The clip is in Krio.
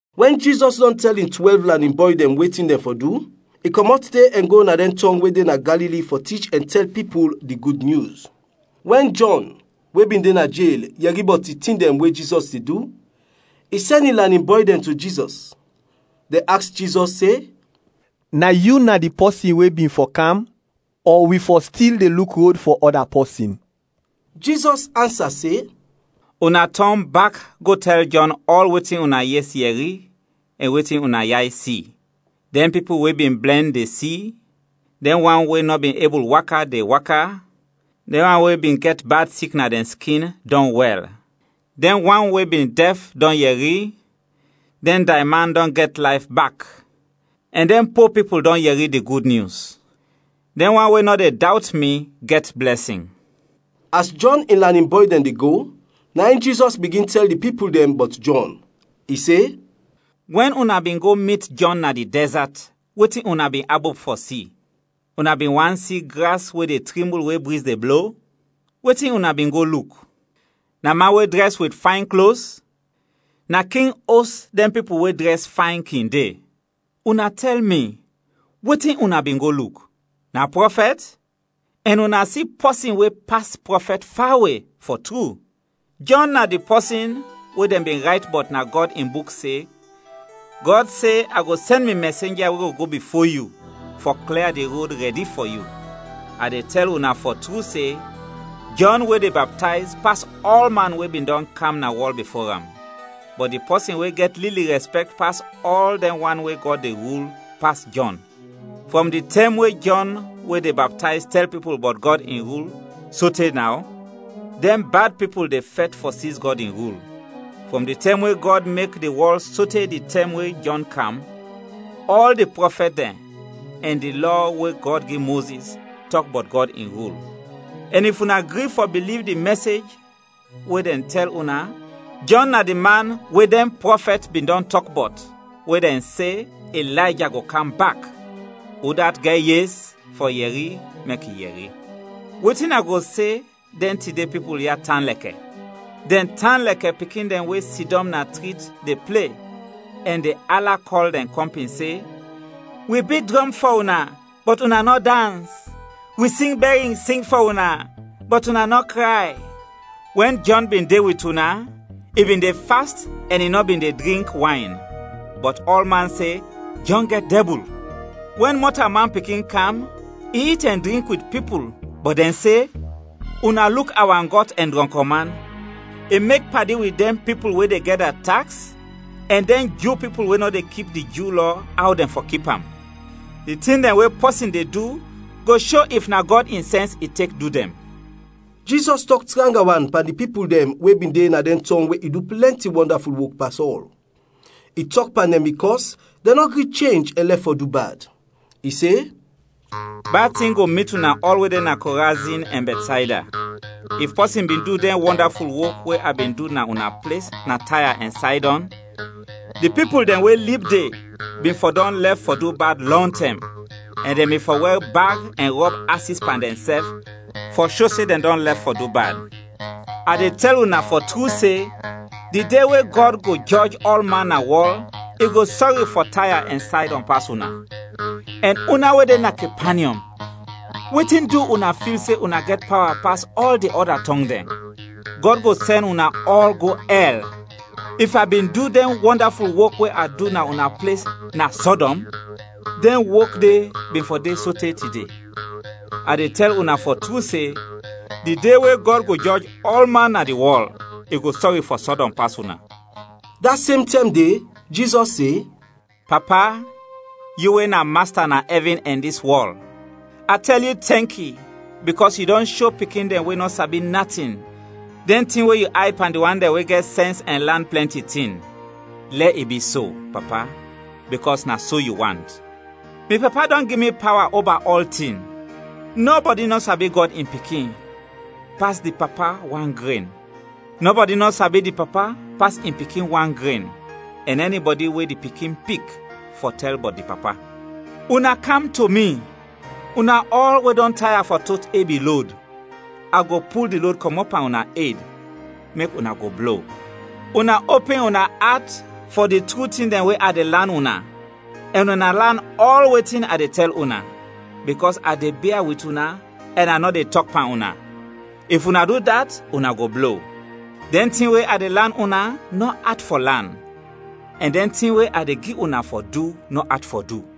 Wɛn Jizɔs dɔn tɛl in twɛlv lanin bɔy dɛn wetin dɛn fɔ du, i kɔmɔt de ɛn go na dɛn tɔng we de na Galili fɔ tich ɛn tɛl pipul di Gud Nyus. Wɛn Jɔn, we bin de na jel, yɛri bɔt di tin dɛn we Jizɔs de du, i sɛn in lanin bɔy dɛn to Jizɔs, dɛn aks Jizɔs se, “Na yu na di pɔsin we bin fɔ kam, ɔ wi fɔ stil de luk rod fɔ ɔda pɔsin?” Jizɔs ansa se, “Una tɔn bak go tɛl Jɔn ɔl wetin una yes yɛri ɛn wetin una yay si: dɛn pipul we bin blɛn, de si; dɛn wan we nɔ bin ebul waka, de waka; dɛn wan we bin gɛt bad sik na dɛn skin, dɔn wɛl; dɛn wan we bin dɛf, dɔn yɛri; dɛn dayman dɔn gɛt layf bak; ɛn dɛn po pipul dɔn yɛri di Gud Nyus. Dɛn wan we nɔ de dawt mi gɛt blɛsin.” As Jɔn in lanin bɔy dɛn de go, na in Jizɔs bigin tɛl di pipul dɛn bɔt Jɔn, i se, “Wɛn una bin go mit Jɔn na di dɛzat, wetin una bin abop fɔ si? Una bin want si gras we de trimbul we briz de blo? Wetin una bin go luk? Na man we drɛs wit fayn klos? Na king os dɛn pipul we drɛs fayn kin de! Una tɛl mi, wetin una bin go luk? Na prɔfɛt? Ɛn una si pɔsin we pas prɔfɛt fawe, fɔ tru. Jɔn na di pɔsin we dɛn bin rayt bɔt na Gɔd in Buk se, ‘Gɔd se, A go sɛn mi mɛsenja we go go bifo yu, fɔ klia di rod rɛdi fɔ yu.’ A de tɛl una fɔ tru se, Jɔn we de baptayz, pas ɔlman we bin dɔn kam na wɔl bifo am. Bɔt di pɔsin we gɛt lili rɛspɛkt pas ɔl dɛn wan we Gɔd de rul, pas Jɔn. Frɔm di tɛm we Jɔn we de baptayz tɛl pipul bɔt Gɔd in rul, sote naw, dɛn bad pipul de fɛt fɔ siz Gɔd in rul. Frɔm di tɛm we Gɔd mek di wɔl sote di tɛm we Jɔn kam, ɔl di prɔfɛt dɛn ɛn di Lɔ we Gɔd gi Mozis tɔk bɔt Gɔd in rul; ɛn if una gri fɔ biliv di mɛsej we dɛn tɛl una, Jɔn na di man we dɛn prɔfɛt bin dɔn tɔk bɔt we dɛn se Ilayja go kam bak. Udat gɛt yes fɔ yɛri, mek i yɛri! “Wetin a go se dɛn tide pipul ya tan lɛkɛ? Dɛn tan lɛkɛ pikin dɛn we sidɔm na trit de ple, ɛn de ala kɔl dɛn kɔmpin se, ‘Wi bit drɔm fɔ una, bɔt una nɔ dans! Wi sing bɛrin sing fɔ una, bɔt una nɔ kray!’ Wɛn Jɔn bin de wit una, i bin de fast ɛn i nɔ bin de drink wayn, bɔt ɔlman se, ‘Jɔn gɛt dɛbul!’ Wɛn Mɔtalman Pikin kam, i it ɛn drink wit pipul, bɔt dɛn se, ‘Una luk awangɔt ɛn drɔnkɔ man, i mek padi wit dɛn pipul we de gɛda taks ɛn dɛn Ju pipul we nɔ de kip di Ju Lɔ aw dɛn fɔ kip am.’ Di tin dɛn we pɔsin de du go sho if na Gɔd in sɛns i tek du dɛn.” Jizɔs tɔk tranga wan pan di pipul dɛn we bin de na dɛn tɔng we i du plɛnti wɔndaful wok pas ɔl, i tɔk pan dɛn bikɔs dɛn nɔ gri chenj ɛn lɛf fɔ du bad. I se, “Bad tin go mit una ɔl we de na Korazin ɛn Bɛtsayda. If pɔsin bin du dɛn wɔndaful wok we a bin du na una ples, na Taya ɛn Saydɔn, di pipul dɛn we lib de bin fɔ dɔn lɛf fɔ du bad lɔntɛm, ɛn dɛn bin fɔ wɛr bag ɛn rɔb asis pan dɛnsɛf, fɔ sho se dɛn dɔn lɛf fɔ du bad! A de tɛl una fɔ tru se, di de we Gɔd go jɔj ɔlman na wɔl, i go sɔri fɔ Taya ɛn Saydɔn pas una. Ɛn una we de na Kepanyɔm, wetin du una fil se una gɛt pawa pas ɔl di ɔda tɔng dɛn? Gɔd go sɛn una ɔl go ɛl! If a bin du dɛn wɔndaful wok we a du na una ples, na Sɔdɔm, dɛn wok de bin fɔ de sote tide. A de tɛl una fɔ tru se, di de we Gɔd go jɔj ɔlman na di wɔl, i go sɔri fɔ Sɔdɔm pas una.” Da sem tɛm de Jizɔs se, “Papa, yu we na Masta na ɛvin ɛn dis wɔl! A tɛl yu tɛnki bikɔs yu dɔn sho pikin dɛn we nɔ sabi natin, dɛn tin we yu ayd pan di wan dɛn we gɛt sɛns ɛn lan plɛnti tin. Lɛ i bi so, Papa, bikɔs na so yu want. “Mi Papa dɔn gi mi pawa oba ɔltin. Nɔbɔdi nɔ sabi Gɔd in Pikin pas di Papa wan gren; nɔbɔdi nɔ sabi di Papa pas in Pikin wan gren, ɛn ɛnibɔdi we di Pikin pik fɔ tɛl bɔt di Papa. “Una kam to mi, una ɔl we dɔn taya fɔ tot ebi lod, a go pul di lod kɔmɔt pan una ed, mek una go blo. Una opin una at fɔ di tru tin dɛn we a de lan una, ɛn una lan ɔl wetin a de tɛl una, bikɔs a de bia wit una ɛn a nɔ de tɔk pan una; if una du dat, una go blo. Dɛn tin we a de lan una nɔ at fɔ lan ɛn dɛn tin we a de gi una fɔ du nɔ at fɔ du.”